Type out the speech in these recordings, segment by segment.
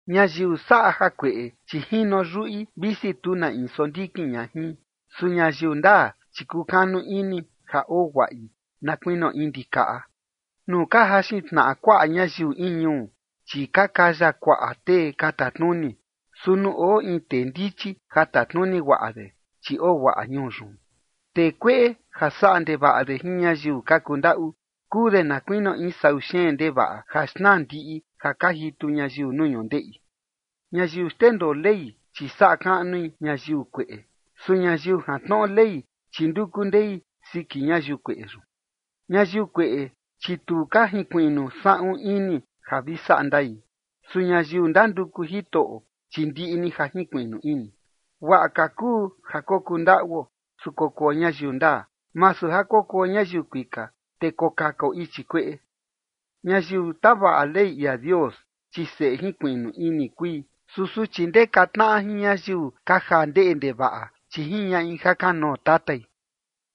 Ñayiu saꞌa jakueꞌe, chi jino yuꞌi, visi tu na in sondikin ña jin. Su ñayiu ndaa, chi kukanu ini ja oo guaꞌi na kuinio in ndikaꞌa. Nuu ka jaxin tnaꞌa kuaꞌa ñayiu in ñuu, chi ka kaya kuaꞌa tee ka tatnuni. Su nuu oo in tee ndichi ja tatnuni guaꞌa de, chi oo guaꞌa ñuu yun. Tee kueꞌe ja saꞌa ndevaꞌa de jin ñayiu ka kundaꞌu, kuu de na kuinio in sau xeen ndevaꞌa ja xnaa ndiꞌi ja ka jitu ñayiu nuu ñundeꞌi. Ñayiu xndendoo Ley, chi saꞌa kaꞌnui ñayiu kueꞌe. Su ñayiu jantnoꞌo Ley, chi nduku ndei siki ñayiu kueꞌe yun. Ñayiu kueꞌe, chi tu ka jinkuiꞌnu saꞌun ini ja vi saꞌa ndai. Su ñayiu ndanduku Jitoꞌo, chi ndiꞌi ni ja jinkuiꞌnu ini. Guaꞌa ka kuu ja kokuu ndaꞌuo, su kokuo ñayiu ndaa, masu ja kokuo ñayiu kuika, te kokakao ichi kueꞌe. Ñayiu tavaꞌa Ley ia Dios, chi seꞌe jinkuiꞌnu ini kui. Su suchi ndeka tnaꞌa jin ñayiu ka jaa ndeꞌe ndevaꞌa, chi jiñaꞌi jakanoo tatai.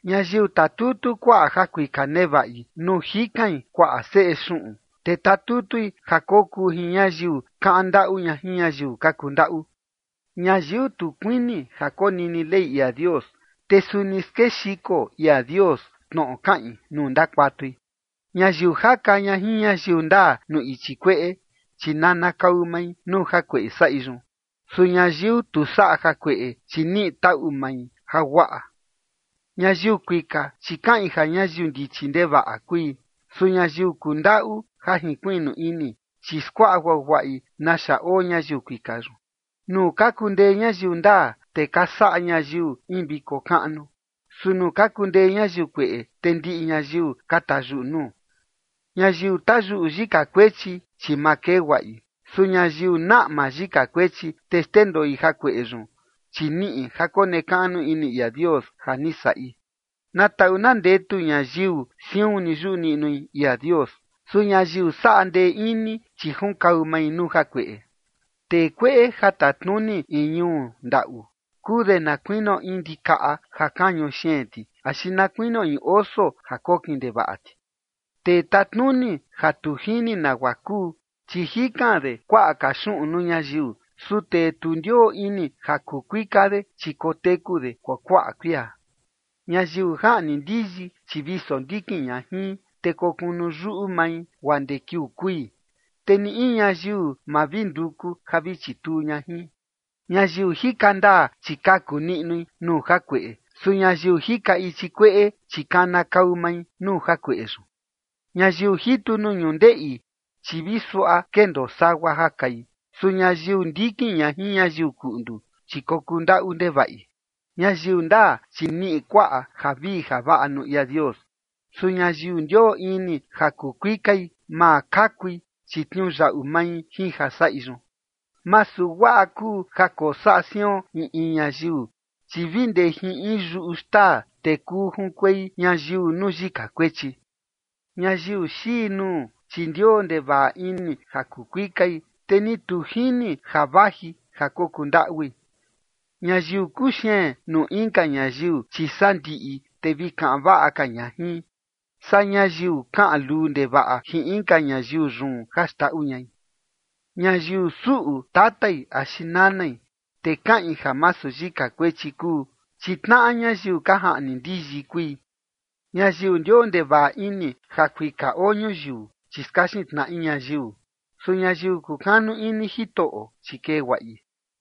Ñayiu tatutu kuaꞌa ja kuika nevaꞌi nuu jikain kuaꞌa seꞌe xuꞌun, te tatutui ja kokuu jin ñayiu kaꞌan ndaꞌu ña jin ñayiu ka kuu ndaꞌu. Ñayiu tu kuini ja konini Ley ia Dios, te suni skexiko ia Dios tnoꞌo kaꞌin nuu ndakuatui. Ñayiu jaka ña jin ñayiu ndaa nuu ichi kueꞌe, chi nanakau mai nuu jakueꞌe saꞌi yun. Su ñayiu tu saꞌa jakueꞌe, chi niꞌi taꞌu mai jaguaꞌa. Ñayiu kuika, chi kaꞌin ja ñayiu ndichi ndevaꞌa kui. Su ñayiu kundaꞌu ja jinkuiꞌnu ini, chi skuaꞌa guaguaꞌi naxa oo ñayiu kuika yun. Nuu ka kundee ñayiu ndaa, te ka saꞌa ñayiu in viko kaꞌnu. Su nuu ka kundee ñayiu kueꞌe, te ndiꞌi ñayiu ka tayuꞌu nuu. Ñayiu tayuꞌu yika kuechi, chi ma kee guaꞌi. Su ñayiu naꞌma yika kuechi, te xndendoi jakueꞌe yun, chi niꞌi ja konekaꞌnu ini ia Dios ja ni saꞌi. Na taꞌu na ndetu ñayiu siun ni yuꞌu niꞌnui ia Dios. Su ñayiu saꞌa ndee ini, chi junkau mai nuu jakueꞌe. Tee kueꞌe ja tatnuni in ñuu ndaꞌu, kuu de na kuinio in ndikaꞌa ja kañu xeen ti, axi na kuinio in oso ja kokin ndevaꞌa ti. Tee tatnuni ja tu jini nagua kuu, chi jikan de kuaꞌa ka xuꞌun nuu ñayiu. Su tee tu ndioo ini ja kuu kuika de, chi koteku de kuakuaꞌa kuia. Ñayiu jaꞌni ndiyi, chi vi sondikin ña jin, te kokunu yuꞌu mai, guaa ndee kiuu kui, te ni in ñayiu, ma vi nduku ja vi chituu ña jin. Ñayiu jika ndaa, chi kaku niꞌnui nuu jakueꞌe. Su ñayiu jika ichi kueꞌe, chi kanakau mai nuu jakueꞌe yun. Ñayiu jitu nuu ñundeꞌi, chi vi suaꞌa kendoo sagua ja kai. Su ñayiu ndikin ña jin ñayiu kuꞌndu, chi kokuu ndaꞌu ndevaꞌi. Ñayiu ndaa, chi niꞌi kuaꞌa javii javaꞌa nuu ia Dios. Su ñayiu ndioo ini ja kuu kuikai, ma kakui, chi tniuyaꞌu mai jin ja saꞌi yun. Masu guaꞌa kuu ja kosaꞌa sion in in ñayiu, chi vi ndee jin in yuꞌu xtaa, te kuu junkuei ñayiu nuu yika kuechi. Ñayiu xii nuu, chi ndioo ndevaꞌa ini ja kuu kuikai, te ni tu jini ja vaji ja kokuu ndaꞌui. Ñayiu kuxeen nuu inka ñayiu, chi sandiꞌi te vi kaꞌan vaꞌa ka ña jin, saa ñayiu kaꞌan luu ndevaꞌa jin inka ñayiu yun ja xndaꞌu ñai. Ñayiu suꞌu tatai axi nanai, te kaꞌin ja masu yika kuechi kuu, chi tnaꞌa ñayiu ka jaꞌni ndiyi kui. Ñayiu ndioo ndevaꞌa ini ja kuika oo ñuyiu, chi skaxin tnaꞌi ñayiu. Su ñayiu kukanu ini Jitoꞌo, chi kee guaꞌi.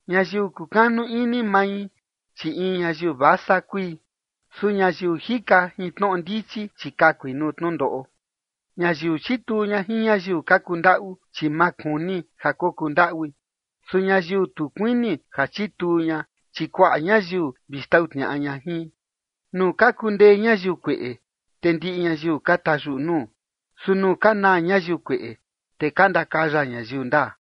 Ñayiu kukanu ini mai, chi in ñayiu vasa kui. Su ñayiu jika jin tnoꞌo ndichi, chi kakui nuu tnundoꞌo. Ñayiu chituu ña jin ñayiu ka kundaꞌu, chi ma kuni ja kokundaꞌui. Su ñayiu tu kuini ja chituu ña, chi kuaꞌa ñayiu vi xtau tniaꞌa ña jin. Nuu ka kundee ñayiu kueꞌe, te ndiꞌi ñayiu ka tayuꞌu nuu. Su nuu ka naa ñayiu kueꞌe, te ka ndakaya ñayiu ndaa.